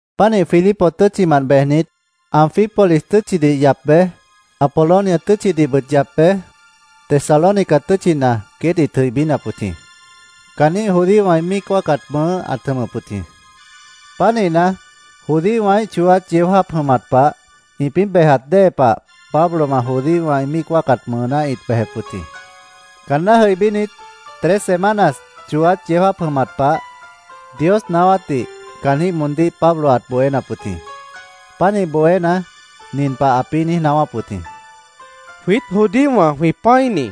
Pánih Filipos tʉ́tchimant bejnit, Anfípolis tʉ́tchidih yap bej, Apolonia tʉ́tchidihbʉt yap bej, Tesalónica tʉ́tchina queét ĩt jʉibínap wʉt jĩ. Caanjĩ́h judíowã ĩ míic wáacat mʉʉ́ ãt jʉmʉp wʉt jĩ. Pánihna, judíowãíh chooát yeó jáap jʉmat pah ĩpĩ́ bejat dée pah Pablowã judíowã ĩ míic wáacat mʉʉná ĩt bejep wʉt jĩ. Caanná jʉibínit, tres semanas chooát yeó jáap jʉmat pah Dios naáwátdih caanjĩ́h moondíh Pablo ãt bohénap wʉt jĩ. Pánih bohéna, nin pah ãpĩ́ niíj naáwáp wʉt jĩ: —Jwiít judíowã, jwĩ pã́ini,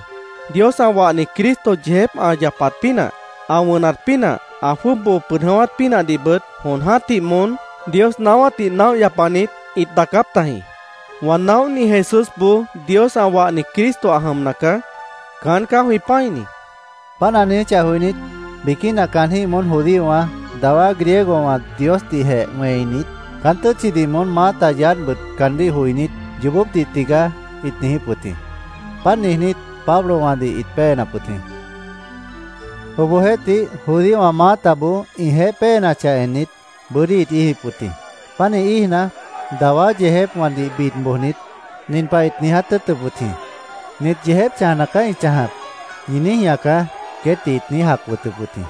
Dios ã wahni Cristo yeejép ã yapat pínah, ã wʉnat pínah, ã jwʉ́ʉb boo pʉd jʉ̃ʉ́wát pínahdihbʉt jon jã́tih moón Dios naáwátdih naóh yapanit ĩt daacáp tajĩ. Wã naóhni Jesúsboó Dios ã wahni Cristo ã jʉmna caá. Caán caá jwĩ pã́ini, ãt niijíp wʉt jĩ. Páant ã niijíchah joinít, biquína caanjĩ́h moón judíowã, dawá Griegowã Diosdihjeh wẽinit, caán tʉ́tchidih moón maáta yaádhbʉt caandíh joinít, “Yoobópdih tigaá”, ĩt niijíp wʉt jĩ. Páant niijnít, Pablowãdih ĩt péenap wʉt jĩ. Obohjeéhtih, judíowã maátaboó ĩjeéh péenachah ennit, bʉ́dí ĩt íijip wʉt jĩ. Pánih íijna, dawá yeejépwãdih bid bojnit, nin pah ĩt niiját tʉ́ʉtʉp wʉt jĩ: “ ‘Nit yeejép chãjna caá ĩ chãjap’, ñi niíj ñaacá”, queétdih ĩt niíj jac wʉtʉp wʉt jĩ.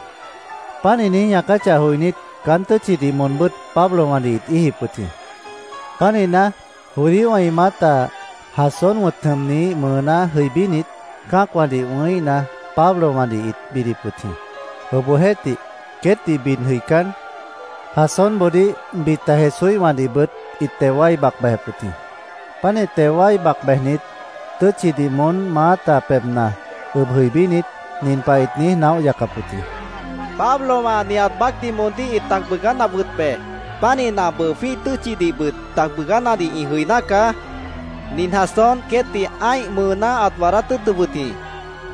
Páant ĩ niíj ñaacáchah joinít, caán tʉ́tchidih moonbʉ́t Pablowãdih ĩt íijip wʉt jĩ. Pánihna, judíowã ĩ maáta Jasón wʉ̃t jʉmniíh mʉʉná jʉibínit, cã́acwãdih wʉ̃híhna, Pablowãdih ĩt bidip wʉt jĩ. Obohjeéhtih, queétdih bid jʉicán, Jasónboodíh, bita Jesúíhwãdihbʉt ĩt teo wái bac bejep wʉt jĩ. Pánih teo wái bac bejnit, tʉ́tchidih moón maáta pebhna ʉb jʉibínit, nin pah ĩt niíj naóh yacap wʉt jĩ: —Pablowã nihat baácdih moondíh ĩt tac bʉʉgánap wʉt be. Pánihna, bʉʉ jwĩ́ih tʉ́tchidihbʉt tac bʉʉgánadih ĩ jʉiná caá. Nin Jasón queétdih ã́ih mʉʉná ãt waadát tʉ́ʉtʉp wʉt jĩ.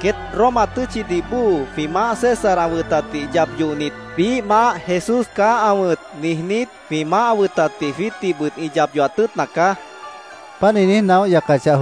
Queét Roma tʉ́tchidih bóo jwĩ maáh César ã wʉtatdih yap yohnit, ‘Biíh maáh, Jesús caá ã wʉ̃t’, niijnít, jwĩ maáh ã wʉtatdih jwiítdihbʉt ĩ yap yohat tʉ́ʉtna caá, ĩt niíj naóh yacap wʉt jĩ.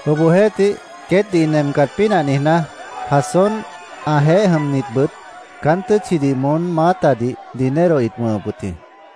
Obohjeéhtih, queétdih ĩ nemcat pínah niijná, Jasón, ãjeéh jʉmnitbʉt caán tʉ́tchidih moón maátadih dinero ĩt wʉ̃hʉp wʉt jĩ.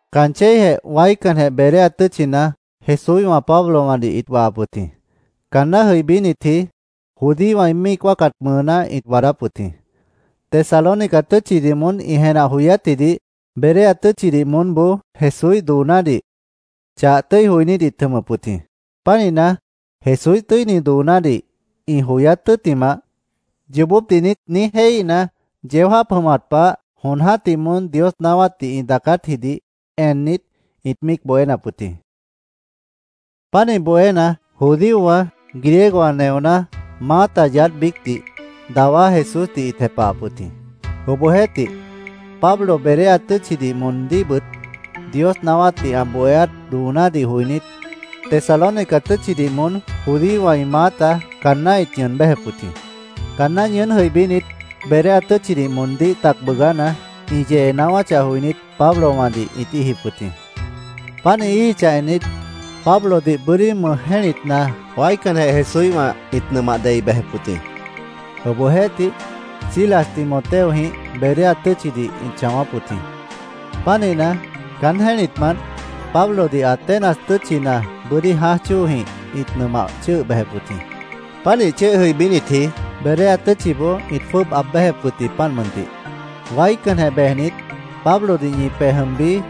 Caan chéijeh waícanjeh Berea tʉ́tchina Jesúíhwã Pablowãdih ĩt wahap wʉt jĩ. Caanná jʉibínitji judíowã ĩ míic wáacat mʉʉná ĩt waadáp wʉt jĩ. Tesalónica tʉ́tchidih moón ĩ jenah joyátjidih Berea tʉ́tchidih moónboó Jesúíh doonádih chah tʉ́i joinít ĩt jʉmʉp wʉt jĩ. Pánihna, Jesúíh tʉ́ini doonádih ĩ joyát tʉ́ttimah, “¿Yoobópdih niít?” niíj jéihíhna, yeó jáap jʉmat pah jon jã́tih moón Dios naáwátdih ĩ daacátjidih ennit, ĩt míic bohénap wʉt jĩ. Pánih bohéna, judíowã, Griegowã neoná, maáta yaádh biícdih, dawá Jesúsdih ĩt jepahap wʉt jĩ. Obohjeéhtih, Pablo Berea tʉ́tchidih moondíhbʉt Dios naáwátdih ã bohéát doonádih joinít, Tesalónica tʉ́tchidih moón judíowã ĩ maáta caanná ĩt ñʉʉn béjep wʉt jĩ. Caanná ñʉʉ́n jʉibínit, Berea tʉ́tchidih moondíh tac bʉʉgána, ĩ yee naáwáchah joinít, Pablowãdih ĩt íijip wʉt jĩ. Páant ĩ íijichah ennit, Pablodih bʉ́dí mʉj jẽ́litna waícanjeh Jesúíhwã ĩt nʉmah dei bejep wʉt jĩ. Obohjeéhtih Silas Timoteojĩh Berea tʉ́tchidih ĩt chãwáp wʉt jĩ. Pánihna, caán jẽ́litmant Pablodih Atenas tʉ́tchina bʉ́dí jãáj chóojĩh ĩt nʉmah chʉ́ʉh bejep wʉt jĩ. Pánih chʉ́ʉh jʉibínitji, Berea tʉ́tchiboó ĩt jwʉ́ʉb aab béjep wʉt jĩ, páant mʉntih. “Waícanjeh bejnit, Pablodih ñi pej jʉm bií”,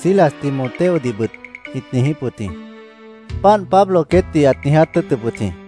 Silas Timoteodihbʉt ĩt niijíp wʉt jĩ. Páant Pablo queétdih ãt niiját tʉ́ʉtʉp wʉt jĩ.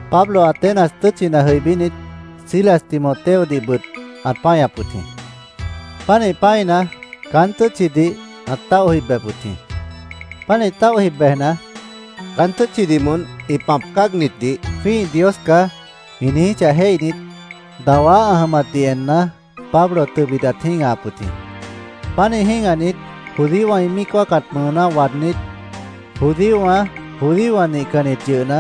Pablo Atenas tʉ́tchina jʉibínit, Silas Timoteodihbʉt ãt páñap wʉt jĩ. Pánih pã́ina, caán tʉ́tchidih ãt táoh jib bejep wʉt jĩ. Pánih táoh jib bejna, caán tʉ́tchidih moón ĩ pãp cáagnitdih “Jwĩ́ih dios caá”, ĩ niijíchah jéihnit, dawá ã jʉmatdih enna, Pablo tʉbit ãt jĩ́gahap wʉt jĩ. Pánih jĩ́gahnit, judíowã ĩ míic wáacat mʉʉná waadnít, judíowã, judíowã nihcannit yʉhna,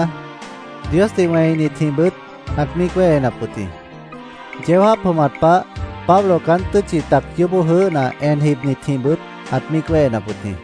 Diosdih wẽinitjĩhbʉt ãt míic wéhenap wʉt jĩ. Yeó jáap jʉmat pah Pablo caán tʉ́tchi tac yoóbó jʉʉ́hna en jibnitjĩhbʉt ãt míic wéhenap wʉt jĩ.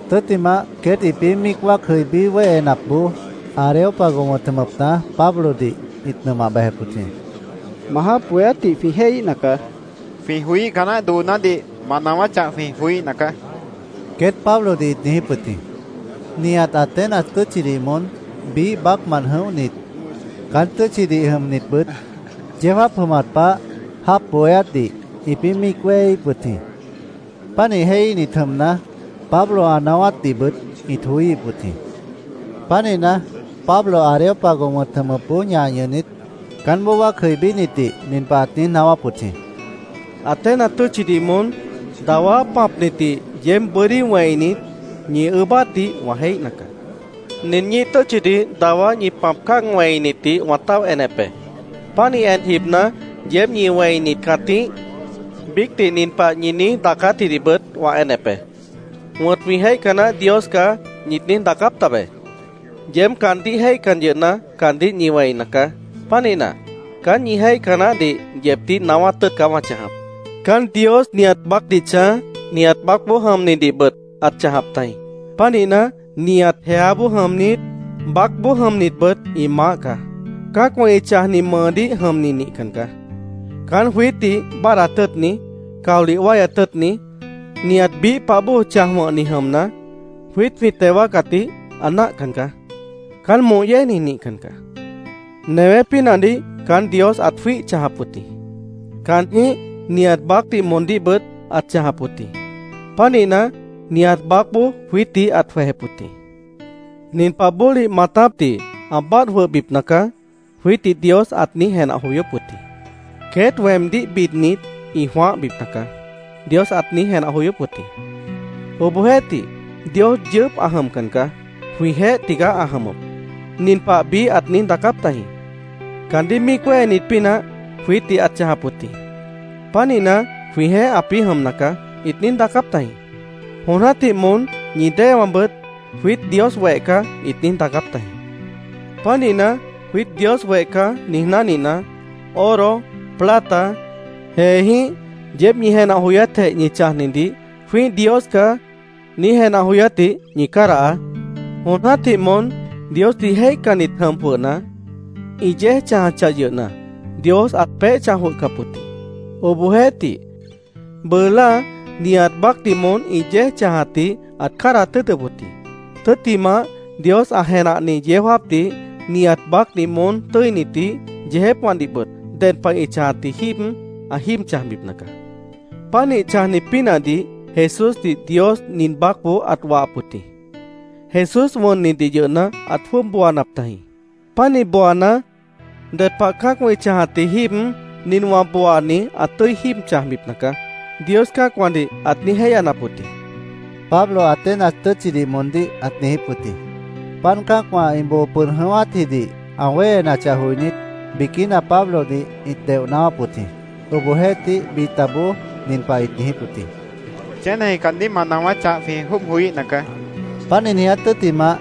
Tʉ́ttimah, queét ĩpĩ́ míic wáac jʉibí wéhenapboó, Areópago wʉ̃t jʉmʉpna Pablodih ĩt nʉmah bejep wʉt jĩ. —Ma jáap bohéátdih jwĩ jéihíhna caá. Jwĩ joíca naáh doonádih ma naáwáchah, jwĩ joííhna caá, queét Pablodih ĩt niijíp wʉt jĩ. Nihat Atenas tʉ́tchidih moón, biíh baácmant jʉ̃óhnit caán tʉ́tchidih jʉmnitbʉt, yeó jáap jʉmat pah jáap bohéátdih ĩpĩ́ míic wéheíhip wʉt jĩ. Pánih jéihíhnit jʉmna, Pablo ã naáwátdihbʉt ĩt joííhip wʉt jĩ. Pánihna, Pablo Areópago wʉ̃t jʉmʉpboó ñah ñʉhnit, caánboó wáac jʉibínitdih nin pah ãt niíj naáwáp wʉt jĩ: “Atenas tʉ́tchidih moón, dawá pãpnitdih yeéb bʉ́dí wẽinit, ñi ʉʉ́bátdih wã jéihna caá. Nin ñíih tʉ́tchidih dawá ñi pãp cáag wẽinitdih wã táoh enep be. Pánih en jibna, yeéb ñi wẽinit cãtíh, biícdih nin pah ñi niíj daacátjidihbʉt wã enep be. “Wʉ̃t jwĩ jéihca naáh dios caá”, ñit niíj daacáp tabe. Yeéb caandíh jéihcan yʉhna, caandíh ñi wẽina caá. Pánihna, caán ñi jéihca naáhdih yeebdíh naáwát tʉ́ʉt caá wã chãjap. “Caán Dios nihat baácdih chãj, nihat baácboó jʉmnidihbʉt ãt chãjap tajĩ. Pánihna, nihat jeáboó jʉmnit, baácboó jʉmnitbʉt ĩ maáh caá. Cã́acwã ĩ chãjni mʉʉdíh jʉmni nihcan caá. Caán jwiítdih báadhdat tʉ́ʉtni, caolih wáyat tʉ́ʉtni, nihat biíh pah bóo chãj wʉ̃hni jʉmna, jwiít jwĩ teo wáacatdih ã náahcan caá. Caán moh yéejni nihcan caá. “Newé pínahdih caán Dios ãt jwíih chãjap wʉt jĩ. Caanjĩ́h nihat baácdih moondíhbʉt ãt chãjap wʉt jĩ. Pánihna, nihat baácboó jwiítdih ãt jwejep wʉt jĩ. ‘Nin pah bólih maatápdih ã báadh jwʉhbipna caá’, jwiítdih Dios ãt niíj jenah joyóp wʉt jĩ. ‘Queét weemdíh bidnit, ĩ jwãáhbipna caá’, Dios ãt niíj jenah joyóp wʉt jĩ. Obohjeéhtih, Dios yʉʉ́p ã jʉmcan caá. Jwĩjeéh tigaá ã jʉmʉp. Nin pah biíh ãt niíj daacáp tajĩ: ‘Caandíh míic wéhenit pínah jwiítdih ãt chãjap wʉt jĩ. Pánihna, jwĩjeéh ãpĩ́ jʉmna caá’, ĩt niíj daacáp tajĩ. Jon jã́tih moón ñi déewãbʉt ‘Jwiít Dios weh caá’, ĩt niíj daacáp tajĩ. Pánihna, ‘Jwiít Dios weh caá’, niíj náhnina, oro, plata, jeejĩ́h yeéb ñi jenah joyátjeh ñi chãjnidih ‘Jwĩ́ih dios caá’, niíj jenah joyátdih ñi cádahaá. Jon jã́tih moón Diosdih jéihcannit jʉm jwʉhna, ĩ yéej chãjachah yʉhna, Dios ãt peéh chãj jwʉhcap wʉt jĩ. Obohjeéhtih, bʉʉ láa nihat baácdih moón ĩ yéej chãjatdih ãt cádahat tʉ́ʉtʉp wʉt jĩ. Tʉ́ttimah, Dios ã jenahni yeó jáapdih nihat baácdih moón tʉ́initdih, yeejépwãdihbʉt ded pah ĩ chãjatji jíib ã jíib chãjbipna caá. Pánih chãjni pínahdih Jesúsdih Dios nin baácboó ãt wahap wʉt jĩ. Jesús wʉnnidih yʉhna, ãt jwʉ́ʉb booanap tajĩ. Pánih booana, ‘Ded pah cã́acwã ĩ chãjatji jíib nin wã booani ã tʉ́i jíib chãjbipna caá’, Dios cã́acwãdih ãt niíj jéihyanap wʉt jĩ”, Pablo Atenas tʉ́tchidih moondíh ãt niijíp wʉt jĩ. Páant cã́acwã ĩ boo pʉd jʉ̃ʉ́wátjidih ã wéhenachah joinít, biquína Pablodih ĩt deoh naáwáp wʉt jĩ. Obohjeéhtih, bitaboó nin pah ĩt niijíp wʉt jĩ: —Chéneji caandíh ma naáwáchah, jwĩ jwʉ́ʉb joííhna caá, ĩt niijíp wʉt jĩ. Páant ĩ niiját tʉ́ttimah,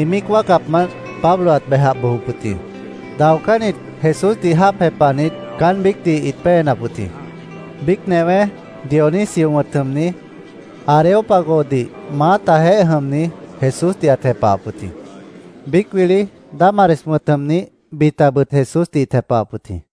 ĩ míic wáacapmant Pablo ãt bejah bojop wʉt jĩ. Daocánnit Jesúsdih jáap jepahnit, caán biícdih ĩt péenap wʉt jĩ. Biíc newé, Dionisio wʉ̃t jʉmni, Areópagodih maátajeéh jʉmni, Jesúsdih ãt jepahap wʉt jĩ. Biíc wili Dámaris wʉ̃t jʉmnih, bitabʉt Jesúsdih ĩt jepahap wʉt jĩ.